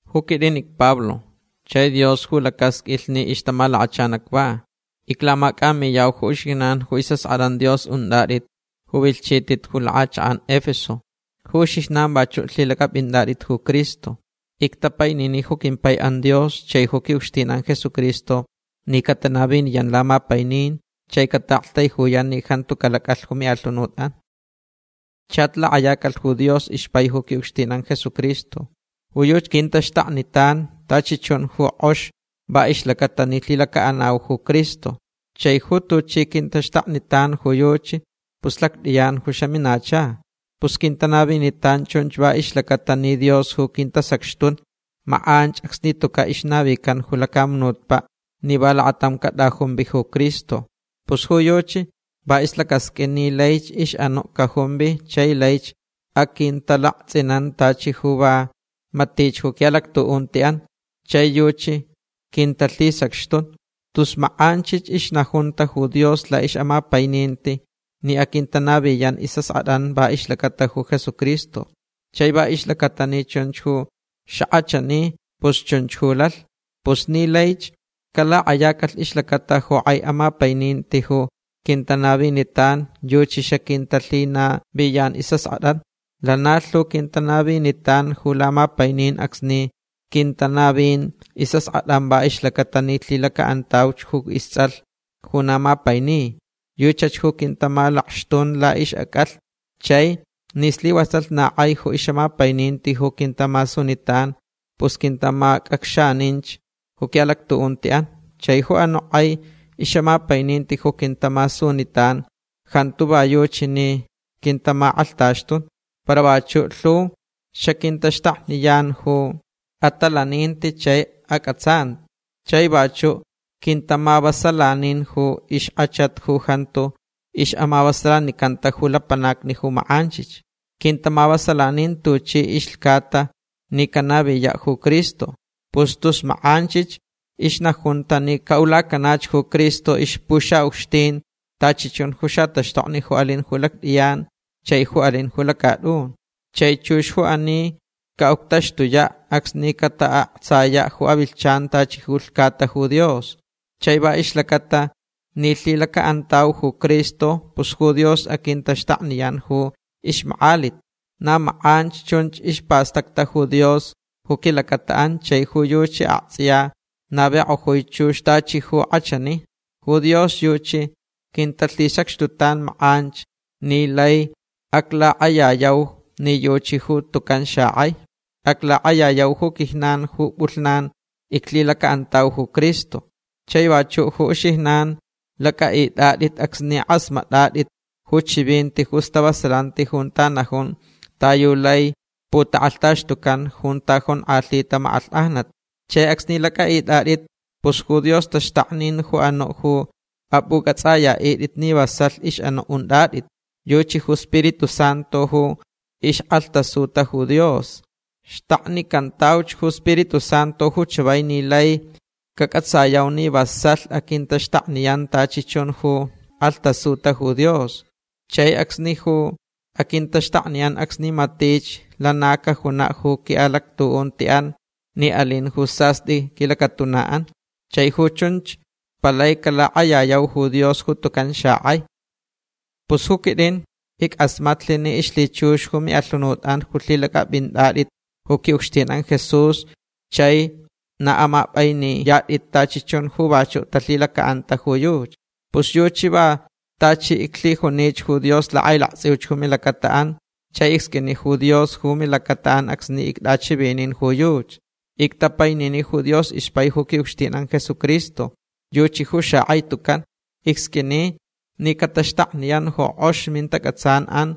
Ju quitʼin icPablo chai Dios ju lacasqʼuilh ni ixtamalakachan acva. Iclamacʼamiyau ju uxijnan ju isʼaskʼatʼan Dios untʼatʼit ju vilhchitʼit ju lakʼachakʼan Efeso. Ju uxijnan vachuʼ lhilacʼapʼintʼatʼit ju Cristo. Ictapainini ju quimpaiʼan Dios chai ju quiʼucxtinʼan Jesucristo ni catanaviniyan lamapainin chai cataʼaktaijuyan ni jantu calacʼalh ju miʼalhunutʼan. Chach lakʼayacalh ju Dios ixpai ju quiʼucxtinʼan Jesucristo. Ju yuchi quintaxtaknitan tachi chun ju kʼox va ixlacaʼatalh ni lhilacaʼanauch ju Cristo. Chai ju tuchi quintaxtaknitan ju yuchi pus lactʼiyan ju xaminacha. Pus quintanavitan chunch va ixlacaʼatalh ni Dios ju quintasacxtun makʼanch acsni tucaʼ ixnavican ju lacamunutpaʼ ni va lakatam catʼajumvi ju Cristo. Pus ju yuchi va islacasqʼuin ni laich ixʼanuʼ cajumvi chai laich aquintalaktsʼinan tachi ju va matich ju quiʼalactuʼuntiʼan chai yuchi quintalhisacxtun. Tus makʼanchich ixnajunta ju Dios laʼixʼamapaininti ni aquintanaviyan isʼaskʼatʼan va ixlacata ju Jesucristo. Chai va ixlacata ni chunch ju xakʼachani pus chunch ju lalh. Pus ni laich calakʼayacalh ixlacata ju kʼai ixʼamapaininti ju quintanavinitan yuchi xaquintalhinaviyan isʼaskʼatʼan. Lana lhu quintanavinitan ju lamapainin acsni quintanavin isʼaskʼatʼan va ixlacata ni lhilacaʼantauch ju istsʼalh ju na mapaini. Yuchach ju quintamalakxtun laʼixʼacʼalhni. Chai ni slivasalh na kʼai ju ixʼamapaininti ju quintamasunitan pus quintamacʼacxaninch ju quiʼalactuʼuntiʼan. Chai ju anuʼ kʼai ixʼamapaininti ju quintamasunitan jantu va yuchi ni quintamakʼalhtaxtun. Para vachuʼ lhu xaquintaxtakniyan ju atalaninti chai acʼatsanti. Chai vachuʼ quintamavasalanin ju ixkʼachat ju jantu ixʼamavasalanicanta ju lapanacni ju makʼanchich. Quintamavasalanin tuchi ilhcata ni canaviyaʼ ju Cristo. Pus tus makʼanchich ixnajunta ni caʼulacanach ju Cristo ixpuxaʼucxtin tachi chun ju xataxtokni ju alin lactʼiyan chai ju alinch ju lacatʼun. Chai chux ju ani caʼuctaxtuyaʼ acsni cataʼaktsayaʼ ju avilhchan tachi ju ilhcata ju Dios. Chai va ixlacata ni lhilacaʼantau ju Cristo pus ju Dios aquintaxtakniyan ju ixmakʼalit. Na makʼanch chunch ispastacta ju Dios ju quilacataʼan chai ju yuchi aktsʼiya navikʼojui chux tachi ju kʼachani. Ju Dios yuchi quintalhisacxtutan makʼanch ni laich aclakʼayayau ni yuchi ju tucan xakʼai. Aclakʼayayau ju quijnan ju pʼulhnan iclhilacaʼantauch ju Cristo. Chai vachuʼ ju uxijnan lacʼaʼitʼatʼit acsni kʼasmatʼatʼit ju chivinti ju stavasalanti junta najun ta yu laich putakʼalhtaxtucan junta jonkʼalhita makʼalhkʼajnat. Chai acsni lacʼaʼitʼatʼit pus ju Dios taxtaknin ju anuʼ ju apʼucʼatsʼayaʼitʼit ni vasalh ixʼanuʼ untʼatʼit. Yuchi ju Spiritu Santu ju ixkʼalhtasuta ju Dios. Xtaknicantauch ju Spiritu Santu ju chavai ni laich cacʼatsayau ni vasalh aquintaxtakniyan tachi chun ju kʼalhtasuta ju Dios. Chai acsnich ju aquintaxtakniyan acsni matich lana cajunaʼ ju quiʼalactuʼuntiʼan ni alin ju sastʼi quilacatunaʼan. Chai ju chunch palai calakʼayayau ju Dios ju tucan xakʼai. Pus ju quitʼin ickʼasmatlh ni ixlhichux ju miʼalhunutʼan ju lhilacʼapʼintʼatʼit ju quiʼucxtinʼan Jesús chai na amapʼainiyatʼit tachi chun ju vachuʼ talhilacaʼanta ju yuchi. Pus yuchi va tachi iclhijunich ju Dios lakʼailaktsʼiuch ju milacataʼan chai icsqʼuini ju Dios ju milacataʼan acsni ictʼachivinin ju yuchi. Ictapainini ju Dios ixpai ju quiʼucxtinʼan Jesucristo. Yuchi ju xakʼai tucan. Icsqʼuini ni cataxtakniyan ju kʼox mintacʼatsanʼan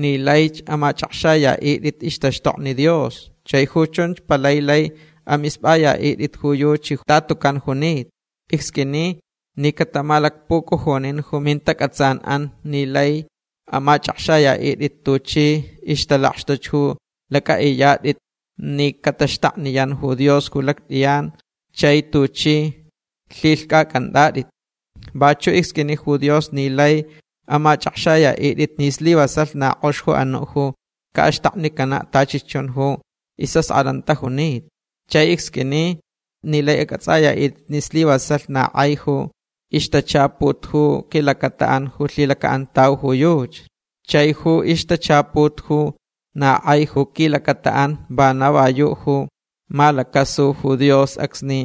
ni laich amachʼakxayaʼitʼit ixtaxtokni Dios. Chai ju chunch palai lai amispʼayaʼitʼit ju yuchi ta tucan junita. Icsqʼuini ni catamalacpucujunin ju mintacʼatsanʼan ni laich amachʼakxayaʼitʼit tuchi ixtalakxtuch ju lacʼaʼiyatʼit ni cataxtakniyan ju Dios ju lactʼiyan chai tuchi lhilhcʼacʼantʼatʼit. Vachuʼ icsqʼuini ju Dios ni laich amachʼakxayaʼitʼit ni slivasalh na kʼox ju anuʼ ju caʼaxtaknicanaʼ tachi chun ju isʼaskʼatʼan tajunita. Chai icsqʼuini ni laich acʼatsʼayaʼitʼit ni slivasalh na kʼai ju ixtachaput ju quilacataʼan ju lhilacaʼantauch ju yuchi. Chai ju ixtachaput ju na kʼai ju quilacataʼan vana va yuʼ ju malacasulh ju Dios acsni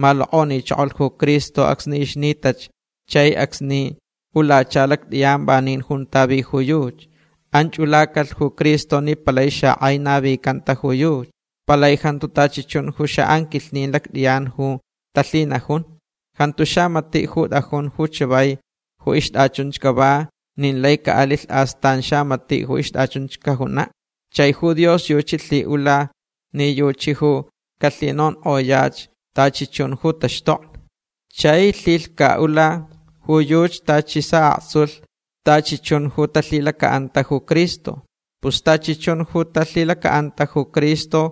malokʼonichokolh ju Cristo acsni ixnitach chai acsni ulacha lactʼiyan vanin junta vi ju yuchi. Anch ulacalh ju Cristo ni palai xakʼai navicanta ju yuchi. Palai jantu tachi chun ju xaʼanquilhnin lactʼiyan ju talhinajun. Jantu xamatiʼ ju tʼajun ju chavai ju ixtʼachunch cava nin lai caʼalilh astan xamatiʼ ju ixtʼachunch cajunaʼ. Chai ju Dios yuchi lhiʼula ni yuchi ju calhinonkʼoyach tachi chun ju taxtokni. Chai lhilhcaʼula ju yuchi tachi saʼaktsulh tachi chun ju talhilacaʼanta ju Cristo. Pus tachi chun ju talhilacaʼanta ju Cristo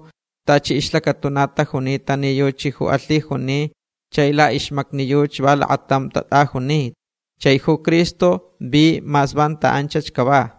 tachi ixlacatuna tajunita ni yuchi ju alhijuni chai laʼixmacni yuchi va lakatam tatʼajunita. Chai ju Cristo vi mas vanta anchach cava.